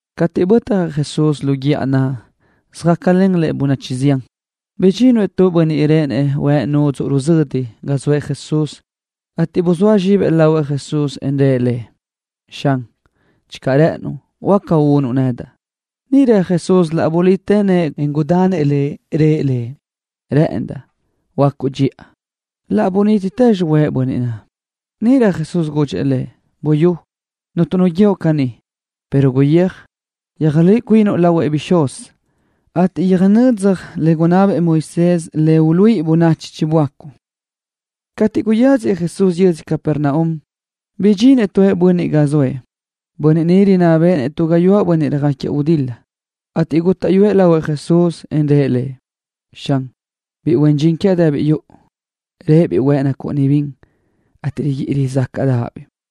Cateʼ bötjëʼ Jesús lu guíʼa naʼ, söjácalen bönachi zián Lëʼ. Bidxinëʼ tu bönniʼ réʼenëʼ huëʼ nudzuʼ ruzödi ga zoëʼ Jesús, ateʼ buzóa zxibëʼ lahuëʼ Jesús, en rëʼ Lëʼ: —Xan, channö rë́ʼënuʼ, huáca unuʼ nedaʼ. Níʼirö Jesús laʼ bulitë nëʼë, en gudanëʼ lëʼ. Rëʼ lëʼ: —Rë́ʼëndaʼ. Huöácuʼ dxiʼa. Laʼ bunítitë xihuëʼë bönniʼ huëʼ naʼ. Níʼirö Jesús gudxëʼ lëʼ: —Buyú, cuntu nu guíoʼ caní, pero guyéaj, yöjluíʼi cuinuʼ lahuëʼ bixúz, ateʼ yöjnödzaj le gunná bëʼë Moisés le uluíʼi bönachi chiböácuʼ. Cateʼ guyáziëʼ Jesús yödzö Capernaum, bidxinëʼ tu bönniʼ ga zoëʼ, bönniʼ rinná béʼenëʼ tu gáyuʼë bönniʼ röjáquiëʼ gudil-la, ateʼ gútaʼyuëʼ lahuëʼ Jesús, en rëʼ Lëʼ: —Xan, biʼi huen dxin quiaʼ dëbiʼ yuʼu, réʼebiʼ huëʼ nacúʼunibiʼ bin, ateʼ riguíʼi rizácaʼdaʼabiʼ.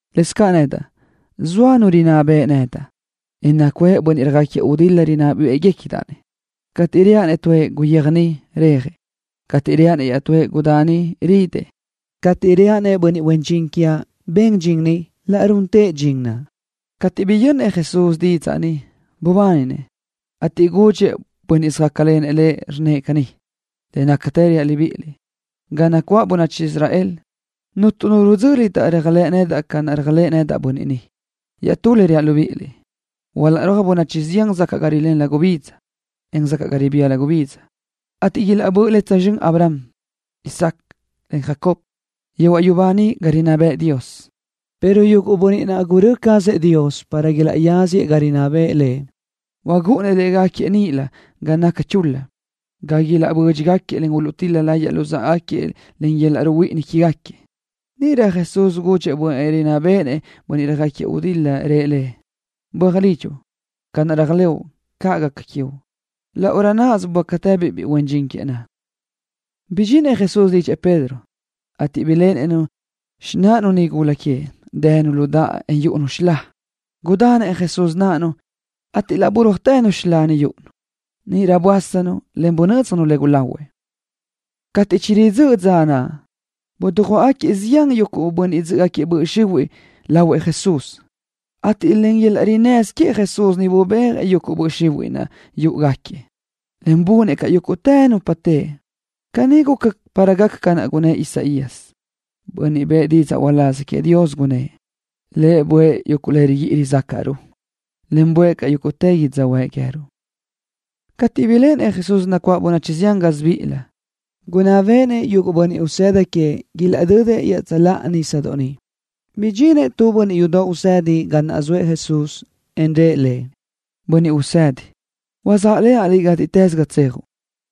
Lëscaʼ nedaʼ, zoa nu rinná beʼe nedaʼ, en nacuʼë caʼ bönniʼ röjáquiëʼ gudil-la rinná béʼegacadaʼ-nëʼ. Cateʼ reaʼ-nëʼ tuëʼ: “Guyéaj niʼ”, rejëʼ. Cateʼ reaʼ-nëʼ iaʼtúëʼ: “Gudá ni”, ridëʼ. Cateʼ reaʼ-nëʼ bönniʼ huen dxin quiaʼ: “Ben dxin ni”, laʼ runtëʼ dxin naʼ. Cateʼ biyönnëʼ Jesús didzaʼ ni, bubáninëʼ, ateʼ gudxëʼ bönniʼ söjácalenëʼ Lëʼ, rnnëʼ: —Le nácatë reaʼ libíʼiliʼ, ga nacuáʼ bönachi Israel, cuntu nu bönniʼ röjxéquiʼdaʼ-nëʼ réajlëʼë nedaʼ ca runëʼ bönniʼ ni. Iaʼstú reaʼ libíʼiliʼ: Ilaʼrúaj bönachi zián sacaʼ ga rilén gubidza, en sacaʼ ga ribía gubidza, ateʼ ilaʼböʼlen tsözxö́n Abraham, en Isaac, en Jacob, yehuaʼ yubá niʼ ga rinná bëʼë Dios, pero yuguʼ bönniʼ naʼ gurö́ cazëʼ Dios para ilaʼyáziëʼ ga naʼ rinná bëʼë Lëʼ, chúʼunëʼ légaquiëʼ níʼilö ga naʼ naca chul-la, ateʼ niʼ ilaʼbödxëʼ, en uluʼtil-la láyëʼë lu yöl-laʼ ruhuíʼini quégaquiëʼ. Níʼirö Jesús gudxëʼ bönniʼ naʼ rinná béʼenëʼ bönniʼ röjáquiëʼ gudil-la, rnnëʼ: —Böaj lidxuʼ. Ca naʼ réajlëʼu, caʼ gaca quiuʼ. Laʼ náʼasö böácatëbiʼ biʼi huen dxin queëʼ naʼ. Bidxinëʼ Jesús lidxëʼ Pedro, ateʼ niʼ biléʼenëʼ-nu xináʼanu nigula queëʼ, dënu lu daʼa, en yúʼunu tu xilá. Gudanëʼ Jesús náʼanu, ateʼ laʼ burúajtë xilá naʼ yúʼunu. Níʼirö böásanu, en bunö́dzjanu le gulahuëʼ. Cateʼ chiridzö́ʼ dza naʼ, dujuáʼagaquiëʼ zián bönniʼ yúʼugaca böʼ xihuiʼ légaquiëʼ ga zoëʼ Jesús, ateʼ len yöl-laʼ rinnësö queëʼ bubéajëʼ yuguʼ böʼ xihuiʼ naʼ, en bunëʼ caʼ yúguʼtë nupa teʼe. Caní guca para gaca ca naʼ gunnë́ʼ Isaías, bönniʼ bëʼë didzaʼ uláz queëʼ Dios, gunnë́ʼ: “Lëʼ buʼë yuguʼ le rizácaʼruʼ, en buʼë caʼ yuguʼ yödzöhuë́ʼ queë́ruʼ.” Cateʼ biléʼenëʼ Jesús nacuáʼ bönachi zián gásibiʼilëʼ, gunná béʼenëʼ yuguʼ bönniʼ usëda queëʼ ilaʼdödëʼ iaʼtsöláʼa nísadoʼ niʼ. Bidxinëʼ tu bönniʼ yudoʼ usedi ga naʼ zoëʼ Jesús, en rëʼ Lëʼ: —Bönniʼ Usedi, sáʼlenaʼ Liʼ gátiʼtës ga tsejuʼ.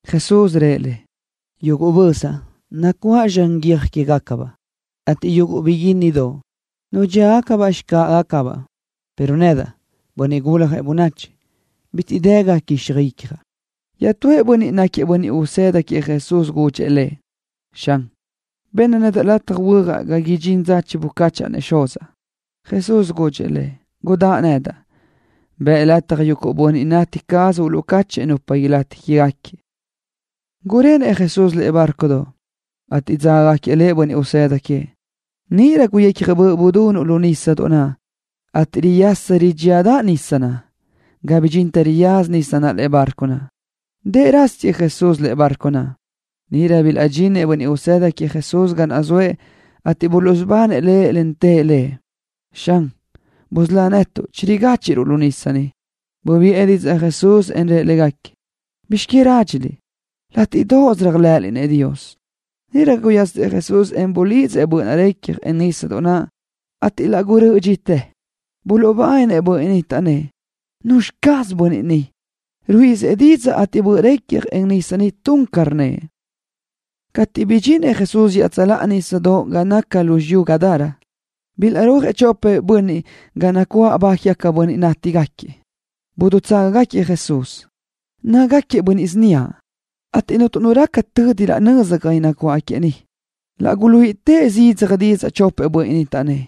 Jesús rëʼ lëʼ: —Yuguʼ bözaʼ nacuáʼ zxan guiö́j quégacabaʼ, ateʼ yuguʼ biguínnidoʼ, nudxíagacabaʼ xicáʼagacabaʼ, pero nedaʼ, Bönniʼ Guljëʼ Bönachi, bitiʼ dë ga quíxaj icjaʼ. Iaʼtúëʼ bönniʼ, náquiëʼ bönniʼ usëda queëʼ Jesús, gudxëʼ Lëʼ: —Xan, benna nedaʼ lataj huöjaʼ ga idxinrö dza chibucáchaʼa-nëʼ xuzaʼ. Jesús gudxëʼ lëʼ: —Gudáʼ nedaʼ. Bëʼ lataj yuguʼ bönniʼ tati cazëʼ uluʼcáchëʼë nupa ilátigaca quégaquiëʼ. Gurenëʼ Jesús lëʼe bárcodoʼ, ateʼ dzágagaquiëʼ Lëʼ bönniʼ usëda queëʼ. Níʼirö guyecja böʼ budunuʼ lu nísadoʼ naʼ, ateʼ riyasa ridxíadaʼ nísadoʼ naʼ ga bidxintë riyaza nisa lëʼe bárcodoʼ naʼ. Dëʼ rásiëʼ Jesús lëʼe barco naʼ. Níʼirö bilaʼdxinëʼ bönniʼ usëda queëʼ Jesús ga naʼ zoëʼ, ateʼ buluʼsubanëʼ Lëʼ, en tëʼ Lëʼ: —Xan, busölá netuʼ. Chirigáchiʼruʼ lu nisa. Bubiʼë didzaʼ Jesús, en rëʼ légaquiëʼ: —¿Bizx que rádxiliʼ? Látiʼdoʼos réajlëʼëliʼ-nëʼ Dios. Níʼirö guyasëʼ Jesús, en bulidzëʼ böʼ naʼ recja, en nísadoʼ naʼ, ateʼ laʼ gurö́ʼötë dxi. Buluʼbáninëʼ bönniʼ naʼ, taʼnnë́ʼ: —¿Nuzxi caz bönniʼ ni? Ruíʼisëʼ didzaʼ, ateʼ böʼ recja, en nísadoʼ tun ca rnnëʼ. Cateʼ bidxinëʼ Jesús iaʼtsöláʼa nísadoʼ ga naʼ naca lu xiyú yödzö Gadara, bilaʼrúajëʼ chopëʼ bönniʼ ga nacuáʼ ba quégaca nupa nátigaca, dutságagaquiëʼ Jesús. Nácagaquiëʼ síniaʼ, ateʼ cuntu nu gaca tödi laʼ nöza niʼ. Laʼ guluíʼitëʼ zidzaj didzaʼ chopëʼ ni, taʼnnë́ʼ: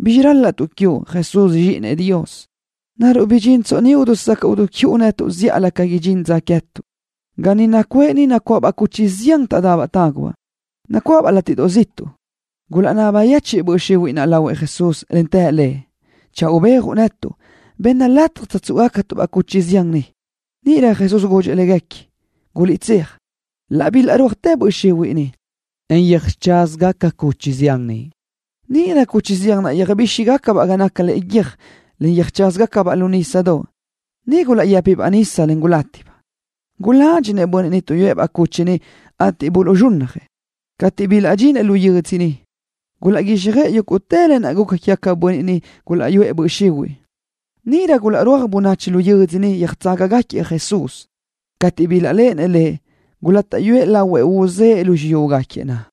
—¿Bizxi ral-laʼtuʼ quiuʼ, Jesús, Zxíʼinëʼ Dios? ¿Naruʼ bidxintsoʼ ni dusacaʼ ziʼu netuʼ zíʼalö ca idxín dza queë́tuʼ? Ga niʼ nacuʼë nacuáʼabaʼ cuchi zián taʼdabaʼ tágubaʼ, nacuáʼabaʼ látiʼdoʼ ga naca ziʼtuʼ. Gulaʼnaba yechiʼ böʼ xihuiʼ naʼ Jesús, en të Lëʼ: —Channö ubéajuʼ netuʼ, benna lataj tsöjtsúʼugacatuʼ-baʼ cuchi zián niʼ. Níʼirö Jesús gudxëʼ léguequi: —Guliʼtséaj. Laʼ bilaʼrúajtë böʼ xihuiʼ, en yöjcházagaca cuchi zián niʼ. Níʼirö yúguʼtëbaʼ cuchi zián naʼ yöjbíxitëgacabaʼ ga naca lëʼe guiö́j, en yöjcházagacabaʼ lu nísadoʼ, ga niʼ gulaʼyë́pibaʼ nisa, en gulátibaʼ. Guládxinëʼ bönniʼ tuʼyúëʼ-baʼ cuchi naʼ, ateʼ buluʼzxúnnajëʼ. Cateʼ bilaʼdxinëʼ lu yödzö, gulaʼguíxjöʼë yúguʼtë lë naʼ guca quégaquiëʼ bönniʼ niʼ gulaʼyúʼu böʼ xihuiʼ légaquiëʼ. Níʼirö bilaʼrúaj bönachi lu yödzö niʼ, yöjtságagaquiëʼ Jesús. Cateʼ bilaʼléʼenëʼ Lëʼ, gulátaʼyuëʼ lahuëʼ uzë́ʼë lu xiyúgaquiëʼ naʼ.